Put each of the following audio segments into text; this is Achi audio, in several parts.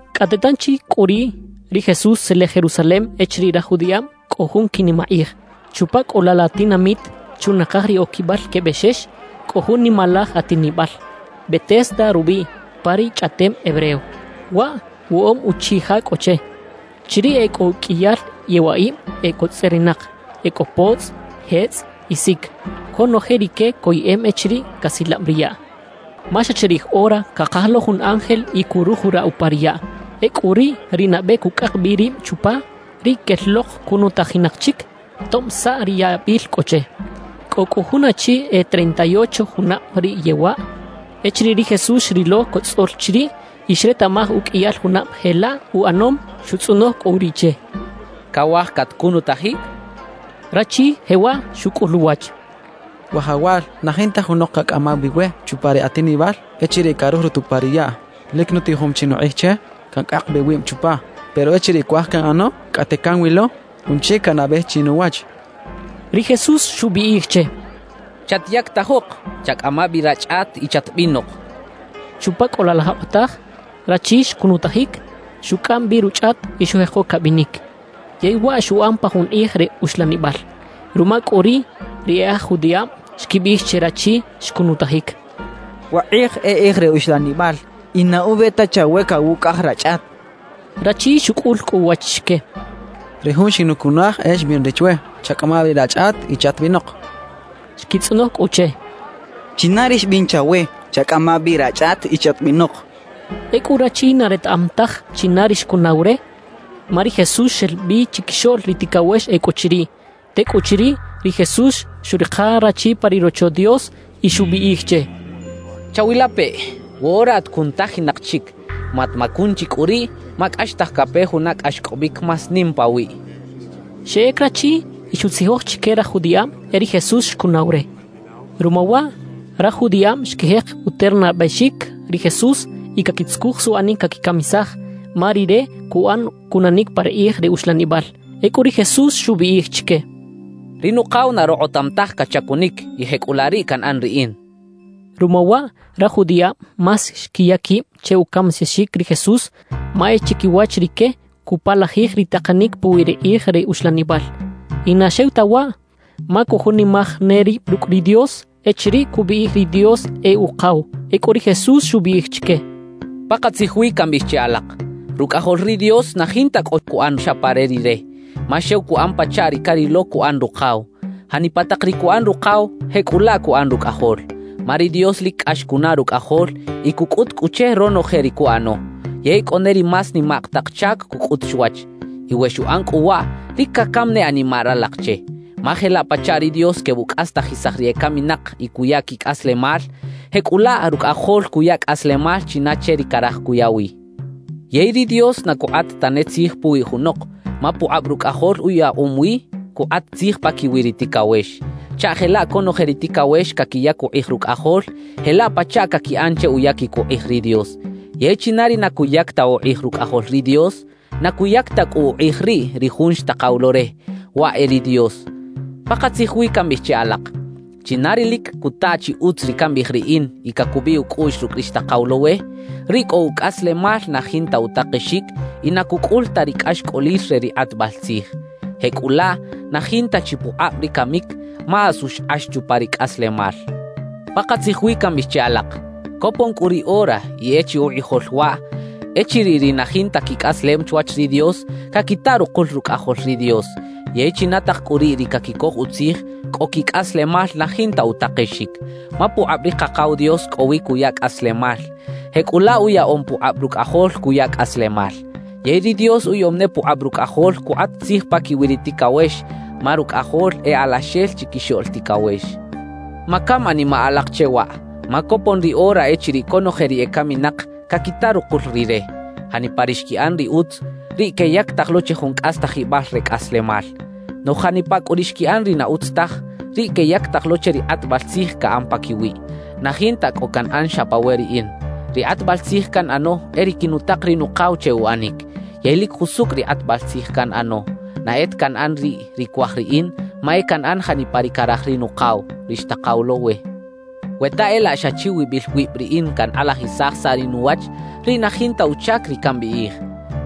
Cꞌate tanchi cꞌu riꞌ, ri Jesús xtzelej Jerusalem echiriꞌ raj judiꞌab cꞌo jun quinimakꞌij. Chupa cꞌu laꞌ la tinamit, chunakaj ri Oquibal que Bexex, cꞌo jun nimalaj atinibal, “Betesda” rubiꞌ pa ri chꞌaꞌtem hebreo. Waꞌ woꞌob uchiꞌ ja cꞌo che. Chiriꞌ e cꞌo uqꞌuiyal yewaꞌib e cotzꞌerinak; e cꞌo potzꞌ, jetzꞌ y sic. Conoje rique coyeꞌem echiriꞌ casilab ri yaꞌ, ma xa chirij ora cakaj lo jun ángel y curujuraꞌ upa ri yaꞌ. Ecꞌu riꞌ ri nabe cucꞌak bi rib chupa, riꞌ quel lok cunutajinak chic tob saꞌ ri yabil cꞌo che. Cꞌo cꞌu jun achi e treinta y ocho junab riꞌ yewaꞌ. Echiriꞌ ri Jesús xrilo cotzꞌol chiriꞌ y xretaꞌmaj uqꞌuiyal junab jelaꞌ uꞌanom, xutzꞌonoj cꞌu riꞌ che: —¿Cawaj catcunutajic? —xchaꞌ. Rachi jewaꞌ xucꞌul uwach: —Wajawal, na jinta junok cacꞌamaw bi we chupa ri atinibal echiriꞌ carujurut upa ri yaꞌ. Lic nutijom chi nukꞌij che cancꞌak bi wib chupa; pero echiriꞌ cuaj canꞌano, cꞌate canwilo jun chic canabej chinuwach —xchaꞌ. Ri Jesús xubiꞌij che: —Chatyactajok, chacꞌama bi rachꞌat y chatbinok —xchaꞌ. Chupa cꞌu laꞌ la jokꞌotaj rachi xcunutajic, xucꞌam bi ruchꞌat y xujeko cabinic. Yey waꞌ xuꞌan pa jun kꞌij re uxlanibal. Ruma cꞌu riꞌ, ri e aj judiꞌab xquibiꞌij che rachi xcunutajic: —Wakꞌij e kꞌij re uxlanibal, y na ube ta chawe cawucꞌaꞌaj rachꞌat —xechaꞌ. Rachi xucꞌul cꞌu uwach chique: —Ri jun xinucunaj e xbiꞌn re chwe: “Chacꞌama bi rachꞌat y chatbinok” —xchaꞌ. Xquitzꞌonoj cꞌu che: —¿China ri xbiꞌn chawe: “Chacꞌama bi rachꞌat y chatbinok”? —xechaꞌ. Ecꞌu rachi na retaꞌam taj china ri xcunaw re, ma ri Jesús xel bi chiquixoꞌl ri ticawex e cꞌo chiriꞌ. Tecꞌuchiriꞌ, ri Jesús xuꞌrika rachi pa ri Rocho Dios y xubiꞌij che: —Chawilapeꞌ: Woꞌora at cunutajinak chic; matmacun chi cꞌu riꞌ, ma cꞌaxtaj cape juna cꞌaxcꞌobic más nim pawiꞌ —xchaꞌ. Xeꞌec rachi y xuꞌtzijoj chique raj judiꞌab e ri Jesús xcunaw re. Ruma waꞌ, raj judiꞌab xquijek uternabexic ri Jesús y caquitzucuj suꞌanic caquicamisaj, ma rire cuꞌan cunanic pa ri kꞌij re uxlanibal. Ecꞌu ri Jesús xubiꞌij chique: —Ri Nukaw na rokꞌotam taj cachacunic y jecꞌulaꞌ riꞌ canꞌan riꞌin —xchaꞌ. Ruma waꞌ raj judiꞌab más xquiya quib che ucamisaxic ri Jesús, ma e chiquiwach rique cupalajij ri takanic puwi ri kꞌij re uxlanibal. Y na xew ta waꞌ, ma cujunimaj ne rib rucꞌ ri Dios echiriꞌ cubiꞌij ri Dios e Ukaw. Ecꞌu ri Jesús xubiꞌij chique: «Pakatzij wi cambiꞌij che alak: Rucꞌajol ri Dios na jinta cꞌo cuꞌan xa pa re Rire; ma xew cuꞌan pachaꞌ ri carilo cuꞌan Rukaw. Janipa tak ri cuꞌan Rukaw, jecꞌulaꞌ cuꞌan Rucꞌajol. »Ma ri Dios lic cꞌax cunaꞌ Rucꞌajol y cucꞌut cꞌu che ronoje ri cuꞌano. Yey cꞌo ne ri más nimak tak chac cucꞌut chwach. Y we xuꞌan cꞌu waꞌ, lic cacam ne animaꞌ ralak che. Ma jelaꞌ pachaꞌ ri Dios quebucꞌastajisaj ri ecaminak y cuya quicꞌaslemal, jecꞌulaꞌ Rucꞌajol cuya cꞌaslemal china che ri caraj cuya wi. Yey ri Dios na cukꞌat tane tzij puwi junok, ma pukꞌab Rucꞌajol uyaꞌom wi cukꞌat tzij paquiwi ri ticawex, chaꞌ jelaꞌ conoje ri ticawex caquiyac ukꞌij Rucꞌajol, jelaꞌ pachaꞌ caquiꞌan che uyaquic ukꞌij ri Dios. Yey china ri na cuyac ta ukꞌij Rucꞌajol ri Dios, na cuyac ta cꞌu ukꞌij riꞌ ri Jun xtakaw lo re, waꞌ e ri Dios. »Pakatzij wi cambiꞌij che alak: China ri lic cuta chi utz ri cambiꞌij riꞌin y cacubiꞌ ucꞌuꞌx rucꞌ ri xtakaw lo we, riꞌ cꞌo ucꞌaslemal na jinta utakexic y na cucꞌul ta ri cꞌaxcꞌolil re ri kꞌatbal tzij. Jecꞌulaꞌ, na jinta chi pukꞌab ri camic, ma asu xkꞌax chupa ri cꞌaslemal. Pakatzij wi cambiꞌij che alak: Copon cꞌu ri ora y e chi ukꞌijol waꞌ echiriꞌ ri na jinta quicꞌaslem chwach ri Dios, caquita rukul Rucꞌajol ri Dios. Yey china tak cꞌu riꞌ ri caquicoj utzij, cꞌo quicꞌaslemal na jinta utakexic. Ma pukꞌab ri Kakaw Dios cꞌo wi cuya cꞌaslemal; jecꞌulaꞌ uyaꞌom pukꞌab Rucꞌajol cuya cꞌaslemal. Yey ri Dios uyaꞌom ne pukꞌab Rucꞌajol cukꞌat tzij paquiwi ri ticawex, ma Rucꞌajol e Alaxel Chiquixoꞌl Ticawex. »Macam animaꞌ alak che waꞌ, ma copon ri ora echiriꞌ conoje ri ecaminak caquita rukul Rire. Janipa ri xquiꞌan ri utz, riꞌ queyactaj lo che jun cꞌastajibal re cꞌaslemal. Noꞌj janipa cꞌu ri xquiꞌan ri na utz taj, riꞌ queyactaj lo che ri kꞌatbal tzij caꞌan paquiwiꞌ. »Na jinta cꞌo canꞌan xa pa we riꞌin. Ri kꞌatbal tzij canꞌano e ri quinutak ri Nukaw che uꞌanic. Yey lic jusucꞌ ri kꞌatbal tzij canꞌano. Na e ta canꞌan riꞌ ri cuaj riꞌin; ma e canꞌan janipa ri caraj ri Nukaw, ri xtakaw lo we. We ta e laꞌ xa chiwibil wib riꞌin cankꞌalajisaj saꞌ ri nuwach, riꞌ na jinta uchac ri cambiꞌij.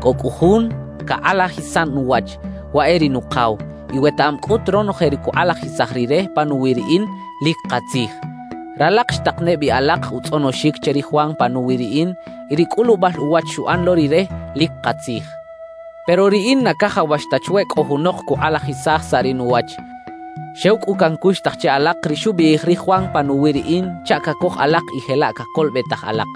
Cꞌo cꞌu Jun cakꞌalajisan nuwach, waꞌ e ri Nukaw, y wetaꞌam cꞌut ronoje ri cukꞌalajisaj Rire panuwi riꞌin, lic katzij. »Ralak xtak ne bi alak utzꞌonoxic che ri Juan panuwi riꞌin; y ri cꞌulubal uwach xuꞌan lo rire, lic katzij. Pero riꞌin na cajawax ta chwe cꞌo junok cukꞌalajisaj saꞌ ri nuwach. Xew cꞌu cancuxtaj che alak ri xubiꞌij ri Juan panuwi riꞌin chaꞌ cacoj alak y jelaꞌ cacolobetaj alak.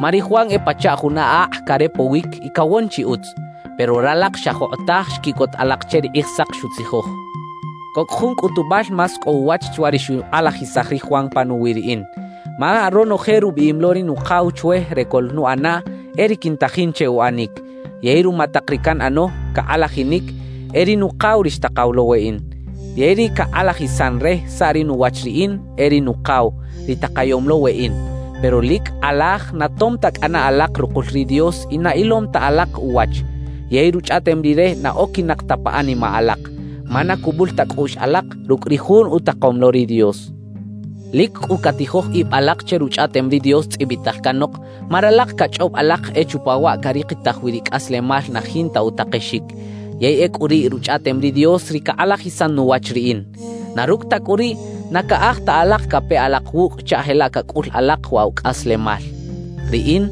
Ma ri Juan e pachaꞌ juna akꞌ carepowic y cawon chi utz. Pero ralak xa jokꞌotaj xquiꞌcot alak che ri Kꞌijsak xutzijoj. »Cꞌo cꞌu jun cꞌutubal más cꞌo uwach chwa ri xukꞌalajisaj ri Juan panuwi riꞌin. Ma ronoje rubiꞌim lo ri Nukaw chwe re coꞌlnuꞌanaꞌ, e ri quintajin che uꞌanic. Yey ruma tak ri canꞌano, cakꞌalajinic, e ri Nukaw ri xtakaw lo weꞌin. Yey ri cakꞌalajisan re saꞌ ri nuwach riꞌin e ri Nukaw, ri takayom lo weꞌin. Pero lic kꞌalaj na tom ta cꞌana alak rukul ri Dios y na ilom ta alak uwach, yey Ruchꞌaꞌtem Rire na oquinak ta pa animaꞌ alak; ma na cubul ta cꞌuꞌx alak rucꞌ ri jun utakom lo ri Dios. »Lic cꞌu catijoj ib alak che Ruchꞌaꞌtem ri Dios tzꞌibital canok; ma ralak cachꞌob alak e chupa waꞌ carikitaj wi ri cꞌaslemal na jinta utakexic. ¡Yey ecꞌu riꞌ Ruchꞌaꞌtem ri Dios ri cakꞌalajisan nuwach riꞌin! Na rucꞌ ta cꞌu riꞌ, na caꞌaj ta alak cape alak wucꞌ chaꞌ jelaꞌ cacꞌul alak waꞌ wa cꞌaslemal. »Riꞌin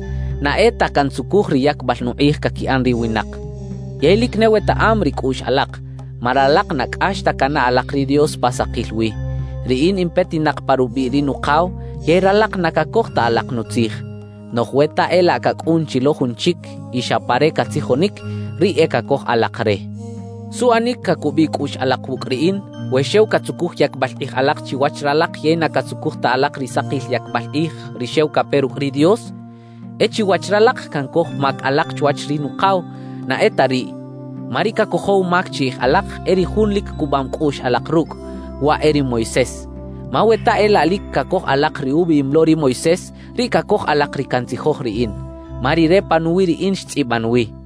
na e ta cantzucuj ri yacbal nukꞌij caquiꞌan ri winak. Yey lic ne wetaꞌam ri cꞌuꞌx alak, ma ralak na cꞌax ta canaꞌ alak ri Dios pa sakil wi. Riꞌin in petinak pa rubiꞌ ri Nukaw yey ralak na cacoj ta alak nutzij. Noꞌj we ta e laꞌ cacꞌun chi lo jun chic y xa pa re catzijonic, riꞌ e cacoj alak re. »¿Suꞌanic cacubiꞌ cꞌuꞌx alak wucꞌ riꞌin, we xew catzucuj yacbal kꞌij alak chiwach ralak yey na catzucuj ta alak ri sakil yacbal kꞌij, ri xew cape rucꞌ ri Dios? E chiwach ralak cancoj mac alak chwach ri Nukaw; na e ta riꞌ. Ma ri cacojow mac chiꞌij alak, e ri jun lic cubam cꞌuꞌx alak rucꞌ; waꞌ e ri Moisés. Ma we ta e laꞌ lic cacoj alak ri ubiꞌim lo ri Moisés, riꞌ cacoj alak ri cantzijoj riꞌin. Ma rire panuwi riꞌin xtzꞌiban wi.